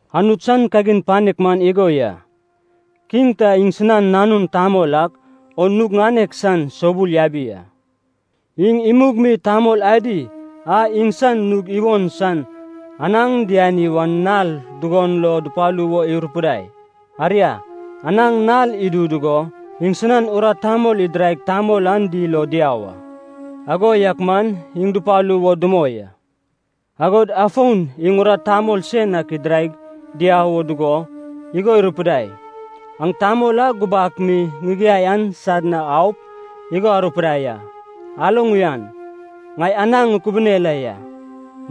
“Anut san kagin panek man igo ya. Kiŋ ta iŋsinan nanun tamol ak o nug ŋanek san soubul yabi a. Iŋ imug mi tamol adi a iŋsan nug iwon san anaŋ diani wan nal dugon lo dupalu wo irupidai. Aria, anaŋ nal idu dugo iŋsinan urat tamol idiraig tamol an dil o diau a. Ago yak man iŋ dupalu wo dumoi a. Agod afon iŋ urat tamol sen ak idiraig diau wo dugo, igo irupidai, ‘Aŋ tamol a gubak mi ŋigiai an sad na aup, igo arupidai a. Aloŋ uyan, ŋai anaŋ ŋukubune la ya.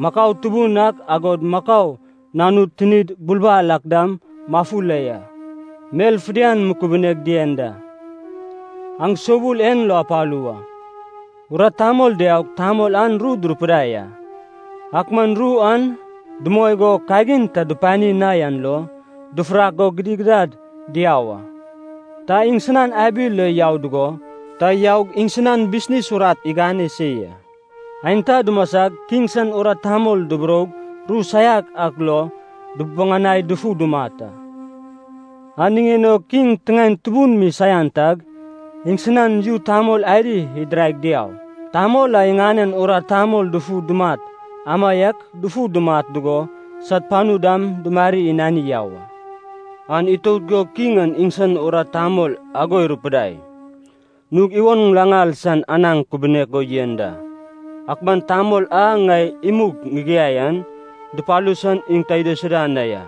Makau tubun ak agod makau nanud tinid bulbal ak dam mafu la ya, mel fidian mukubuneg dien da. Aŋ soubul en lo apalu wa.’ “Urat tamol diaug tamol an ru durupidai a, ak man ru an dumoi go kagin ta dupani na yan lo, dufurak go gidigidad diau a. Ta iŋsinan abi lo yau dugo, ta yaug iŋsinan bisnis urat igane se ya. Aenta dumasag kiŋ san urat tamol duburoug ru saian ak lo dububuŋanaig dufu dumat a. An niŋen o kiŋ tiŋaen tubun mi saian tag, iŋsinan yu tamol adi idiraig diaug, tamol a iŋanen urat tamol dufu dumat, amaiak dufu dumat dugo sad panu dam dumarig inani yau a. “An itout go kiŋ an iŋsan urat tamol ago irupidai, ‘Nug iwon ŋilaŋal san anaŋ kubunek go yen da. Ak man tamol a ŋai imug ŋigiai an, dupalu san iŋ ta idaisuda na ya.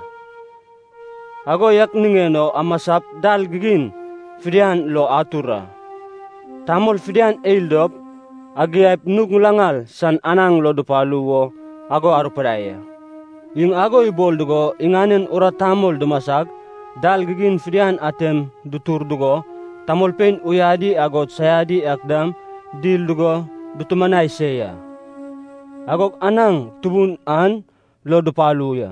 Ago yak niŋen o amasap dal gigin fidian lo atur a, tamol fidian eil dop, agiaip nug ŋilaŋal san anaŋ lo dupalu wo ago arupidai a.’ Iŋ ago ibol dugo, iŋanen urat tamol dumasag, dal gigin fidian atem dutur dugo, tamolpein uyadi agod saiadi ak dam dil dugo dutumanai se ya. Agog anaŋ tubun an lo dupalu ya.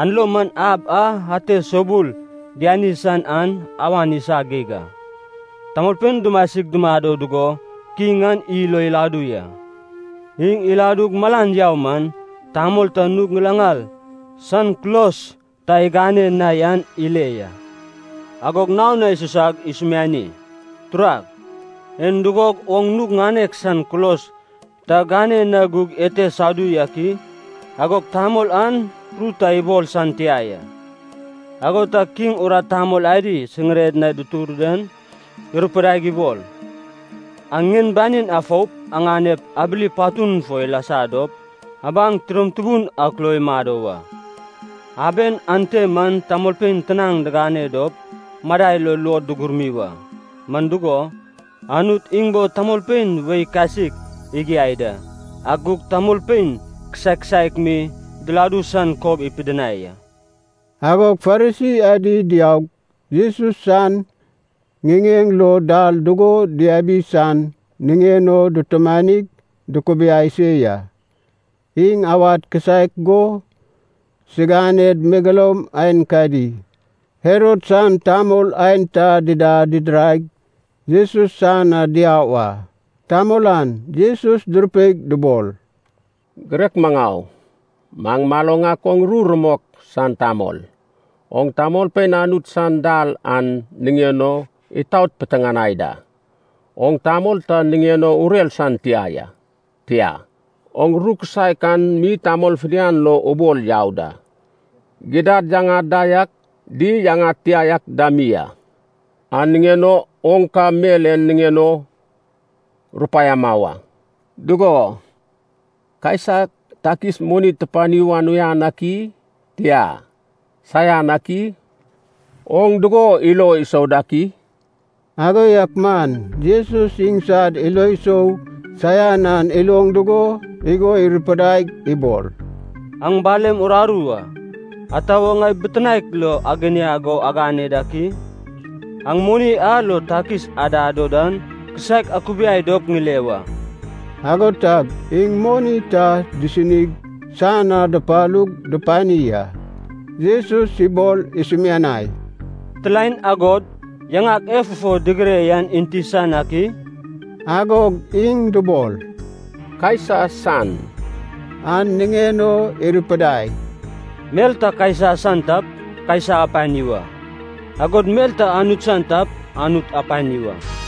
An lo man ab a ate soubul diani san an awan isa geig a. “Tamolpein dumasig dumado dugo kiŋ an yil o iladu ya. Iŋ iladug malan yau man, tamol ta nug ŋilaŋal san kulos ta igane na yan ile ya. Agog naon na isusag isumiani, ‘Turag, en dugog oŋ nug ŋanek san kulos ta gane na gug ente sadu yak i?’ Agog tamol an ru ta ibol san tia ya. “Ago tag kiŋ urat tamol adi siŋiren na dutur dan irupidaig ibol, ‘Aŋ ŋien banin afoup, aŋanep abili patun fo ilasa dop, abaŋ tidom tubun ak lo imado wa. Aben ante man tamolpein tinaŋ digane dop madai lo luod dugurmi wa.’ Man dugo, Anut iŋ bo tamolpein wei kasik igiai da, ak gug tamolpein kisaek kisaek mi diladu san kob ipidinai a.” Agog Farisi adi diaug, Jesus san ŋiŋeŋ lo dal dugo diabi san niŋen o dutumanig dukubiai se ya. Iŋ awad kisaek go, siganed megeloum aenkadi, Herod san tamol aenta dida didiraig, Jesus san na diau a. Tamol an Jesus durupeig dubol, “Girek maŋau, maŋ maloŋ ak oŋ ru rumok san tamol. Oŋ tamolpein Anut san dal an niŋen o itaot mi piteŋanai da. Oŋ tamol ta niŋen o urer san tia ya. Tia, oŋ ru kisaek an mi tamol fidian lo ubol yau da. Gidad yaŋad da yak, di yaŋad tia yak dam mi a. An niŋen o oŋ ka mel en niŋen o rupaiama wa. Dugo, Kaisa takis moni tupani wan uyan ak i? Tia, saian ak i? Oŋ dugo ilo isou dak i?” Ago yak man Jesus iŋsad ilo sou saian an iloŋ dugo igo irupidaig ibol, “Aŋ balem rararu a, ata wo ŋai bitinaek lo aginiag o agane dak i? Aŋ moni a lo takis adad o dan kisaek akubiai dop ŋile wa.” Ago tag iŋ moni ta disinig san na dupalug dupani a. Jesus ibol isumianai, “Mitilaen agod yaŋak e fufo digire yan enti san ak i?” Agog iŋ dubol, “Kaisa san.” An niŋen o irupidai, “Mel ta Kaisa san tap, Kaisa apani wa, agod mel ta Anut san tap, Anut apani wa.”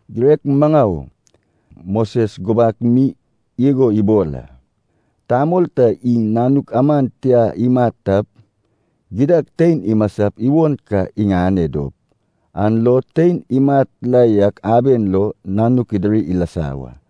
“Girek maŋau, Moses gubak mi igo ibol a. ‘Tamol ta iŋ nanuk aman tiag imat tap, gidad tein imasap iwon ka iŋane dop, an lo tein imat la yak aben lo nanuk idiri ilasa wa.’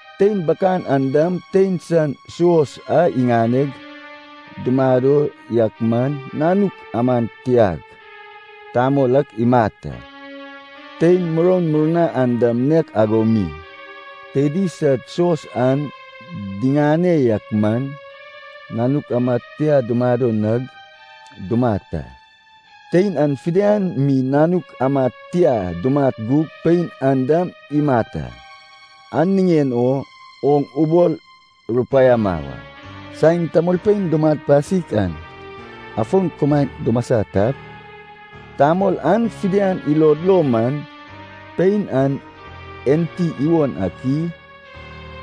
Tein bakan an dam tein san suos a iŋaneg, dumado yak man nanuk amad tiag tamol ak imat a. Tein muroun murna an dam nek ago mi, teidi sad suos an diŋane yak man, nanuk amad tia dumado nag, dumat a. Tein an fidian mi nanuk amad tia dumat gug pein an dam imat a. An niŋen o oŋ ubol rupaiama wa. Saen tamolpein dumat pasik an afon kumaen dumasa tap, tamol an fidian ilod lo man, pein an enti iwon ak i?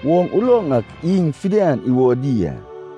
Oŋ uloŋ ak iŋ fidian iwodi a.”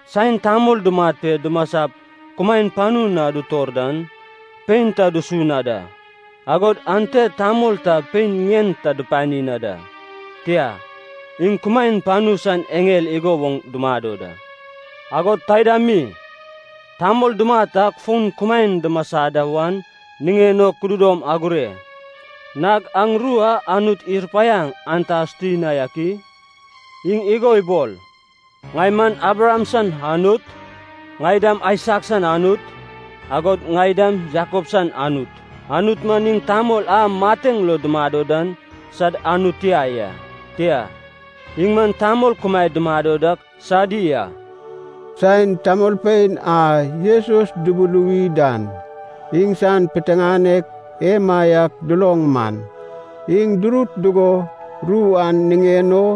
Saen tamol dumat pe dumasap kumaen panu na dutor dan, pein ta dusu na da, agod ante tamol ta pein ŋien ta dupani na da. Tia, iŋ kumaen panu san eŋel igo woŋ dumado da. Agod taida mi, tamol dumat ak fon kumaen dumasa da wan niŋen o kududom agure. Nag aŋ ru a Anut irupaiaŋ an ta asuti na yak i? Iŋ igo ibol, ‘Ŋai man Abraham san Anut, ŋai dam Aisak san Anut, agod ŋai dam Jakob san Anut.’ Anut man iŋ tamol a mateŋ lo dumado dan sad Anut tia ya. Tia, iŋ man tamol kumaed dumado dak sadi a.” Saen tamolpein a Jesus dubuluwi dan iŋsan piteŋanek emaiak duloŋ man, iŋ durut dugo ru an niŋen o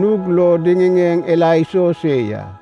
nug lo diŋiŋeŋ ila iso se ya.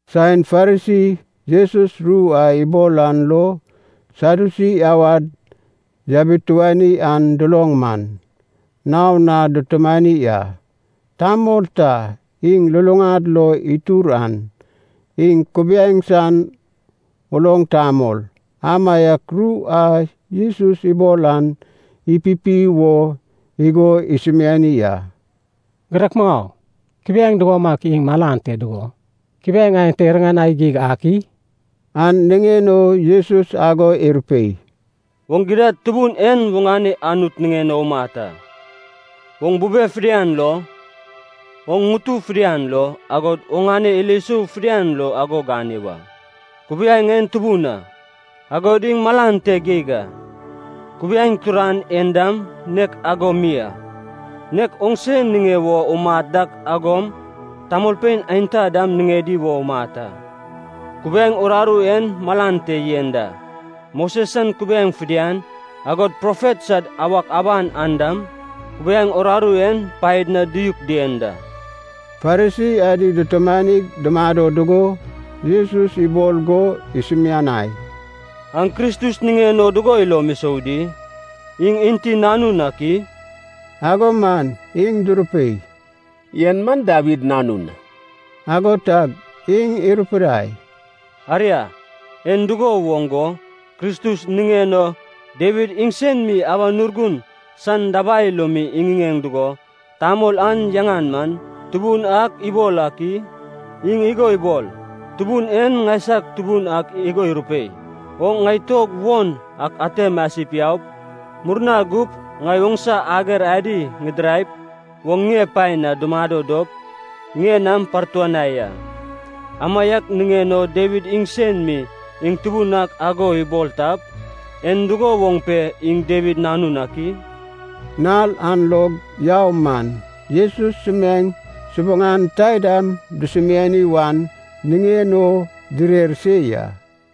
Saen Farisi, Jesus ru a ibol an lo Sadyusi awad yabituani an duloŋ man, naon na dutumani a. Tamol ta iŋ luluŋad lo itur an, iŋ kubiaeŋ san uloŋ tamol, amaiak ru a Jesus ibol an ipipi wo igo isumiani a. “Girek maŋau, kubiaeŋ dugomaiak iŋ malan te dugo, kubiaeŋ aenta iriŋanai geig ak i?” An niŋen o Jesus ago irupei, “Oŋ gidad Tubun en oŋane Anut niŋen o umat a, oŋ bube fidian lo, oŋ ŋutu fidian lo, agod oŋane ilo sou fidian lo ago gane wa. Kubiaeŋ en tubun a, agod iŋ malan te geig a. Kubiaeŋ turan en dam nek ago mi a. Nek oŋse niŋe wo umat dak ago mi, tamolpein aenta dam niŋedi wo umat a. Kubiaeŋ uraru en malan te yen da, Moses san kubiaeŋ fidian, agod profet sad awak aban an dam, kubiaeŋ uraru en paed na diyuk dien da.” Farisi adi dutumanig dumado dugo Jesus ibol go isumianai, “Aŋ Kristus niŋen o dugo ilom isou di? Iŋ enti nanun ak i?” Ago man iŋ durupei, “En man Dawid nanun.” Ago tag iŋ irupidai, “Aria, en dugo woŋ go, Kristus niŋen o, Dawid iŋsen mi Awan Urgun san dabai lo mi iŋiŋeŋ dugo tamol an yaŋan man, Tubun ak ibol ak i? Iŋ igo ibol, ‘Tubun en ŋaisag Tubun ak igo irupei, “Oŋ ŋai tuog won ak ate masip yaup, murna gup ŋai oŋsa ager adi ŋidiraip, oŋ ŋie pae na dumado dop ŋie nam partuanai a.” ’ Amaiak niŋen o Dawid iŋsen mi iŋ Tubun ak ago ibol tap, en dugo woŋ pe iŋ Dawid nanun ak i?” Nal an log yau man, Jesus sumiaeŋ subuŋan taidam dusumiani wan niŋen o direr se ya.